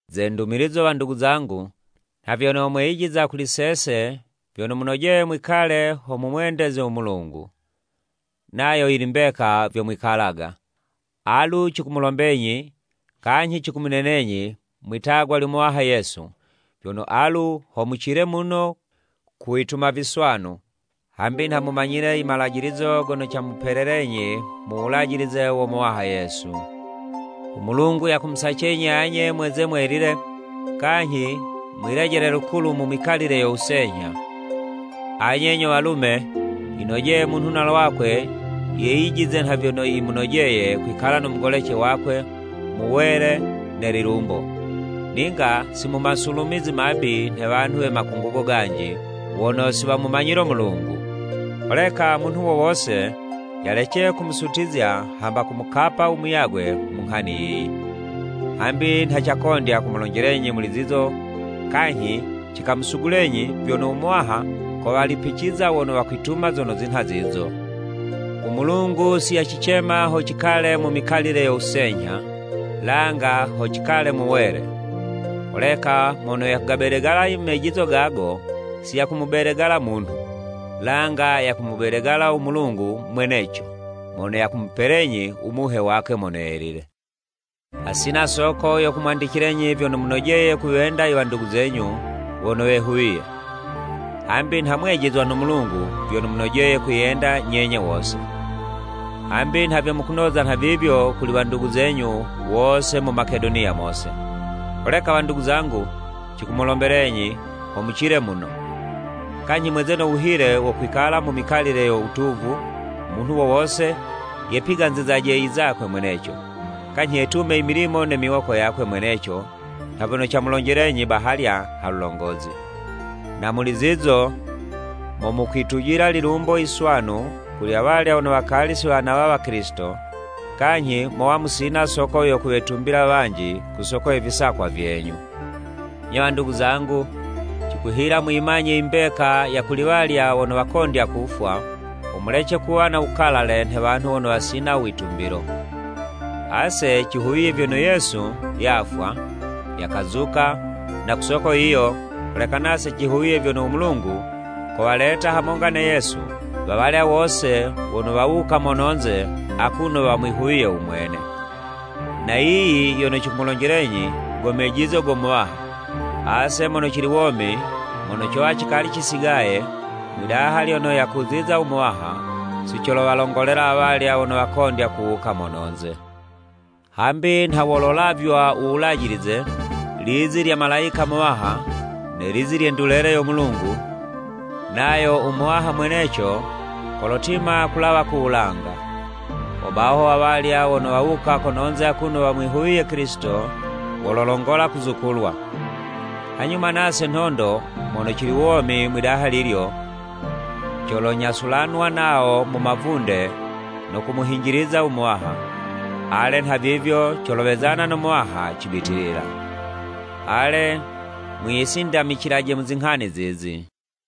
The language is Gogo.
Ze ndumilizo wandugu zangu, nha vyono mweyijiza kuli sese vyono munojeye mwikale ho mumwendeze u Mulungu. Nayo yili mbeka vyo mwikalaga. Alu cikumulombenyi kanyhi cikumunenenyi mwitagwa lyo Muwaha Yesu, vyono alu ho mucile muno kuwituma viswanu. Hambi nha mumanyile i malajilizo gono camupelelenyi mu wulajilize wo Muwaha Yesu. U Mulungu yakumusacenyi anye mweze mwelile kanyhi mwilejele lukulu mu mikalile yo wusenyha. Anye nyo walume, yinojeye munhu na lwakwe yeyijize nha vyono yimunojeye kwikala no mugolece wakwe mu wele ne lilumbo, ninga si mu masulumizi mabi nhe wanhu we makungugo ganji wono si wamumanyile u Mulungu. Holeka munhu wo wose yalece kumusutizya hamba kumukapa u muyagwe mu nghani yiyi. Hambi nha cakondya kumulonjelenyi muli zizo kanyhi cikamusugulenyi vyono u Muwaha kowalipiciza wono wakwituma zono zinha zizo. U Mulungu si yacicema ho cikale mu mikalile yo wusenyha, langa ho cikale mu wele. Holeka mono yakugabedegala i mejizo gago, si yakumubedegala munhu, langa yakumubedegala u Mulungu mweneco mono yakumupelenyi u Muhe wakwe Mono Yelile. Hasina soko yo kumwandicilenyi vyono munojeye kuwenda i wandugu zenyu wono wehuwiye. Hambi nha mwijizwe no Mulungu vyono munojeye kwiyenda nyenye wose. Hambi nha vyo mukunoza nhavivyo kuli wandugu zenyu wose mu Makedoniya mose. Holeka wandugu zangu cikumulombelenyi ho mucile muno. Kanyhi mweze no wuhile wo kwikala mu mikalile yo wutuvu, munhu wo wose yepiganzizaje i zakwe mweneco, kanyhi yetume i milimo ne miwoko yakwe mweneco nha vyono camulonjelenyi bahalya ha lulongozi. Na muli zizo mo mokwitujila lilumbo yiswanu kuli awalya wono wakali si wanawa Wakilisito, kanyhi mowa musina soko yo kuwetumbila wanji ku soko ye visakwa vyenyu. Nyo wandugu zangu, cikuhila muyimanye i mbeka ya kuli walya wono wakondya kufwa, ho mulece kuwa na wukalale nhe wanhu wono wasina u witumbilo. Ase cihuwiye vyono Yesu yafwa, yakazuka, na ku soko yiyo, holeka nase cihuwiye vyono u Mulungu kowaleta hamonga na Yesu wawalya wose wono wawuka mononze akuno wamwihuwiye u mwene. Na yiyi yono cikumulonjelenyi go mejizo go Muwaha, ase mono cili womi, mono cowa cikali cisigaye, mwidaha lyono yakuziza u Muwaha, si colowalongolela awalya wono wakondya kuwuka mononze. Hambi nha wololavywa u wulajilize, lizi lya malayika muwaha, ne lizi lye ndulele yo Mulungu, nayo u Muwaha mweneco kolotima kulawa ku wulanga. Hobaho awalya wono wawuka kononze akuno wamwihuwiye Kilisito, wololongola kuzukulwa. Hanyuma nase nhondo mono cili womi mwidaha lilyo, colonyasulanwa nawo mu mavunde no kumuhinjiliza u Muwaha, ale nhavivyo colowezana no Muwaha cibitilila. Ale mwisindamicilaje mu zinghani zizi.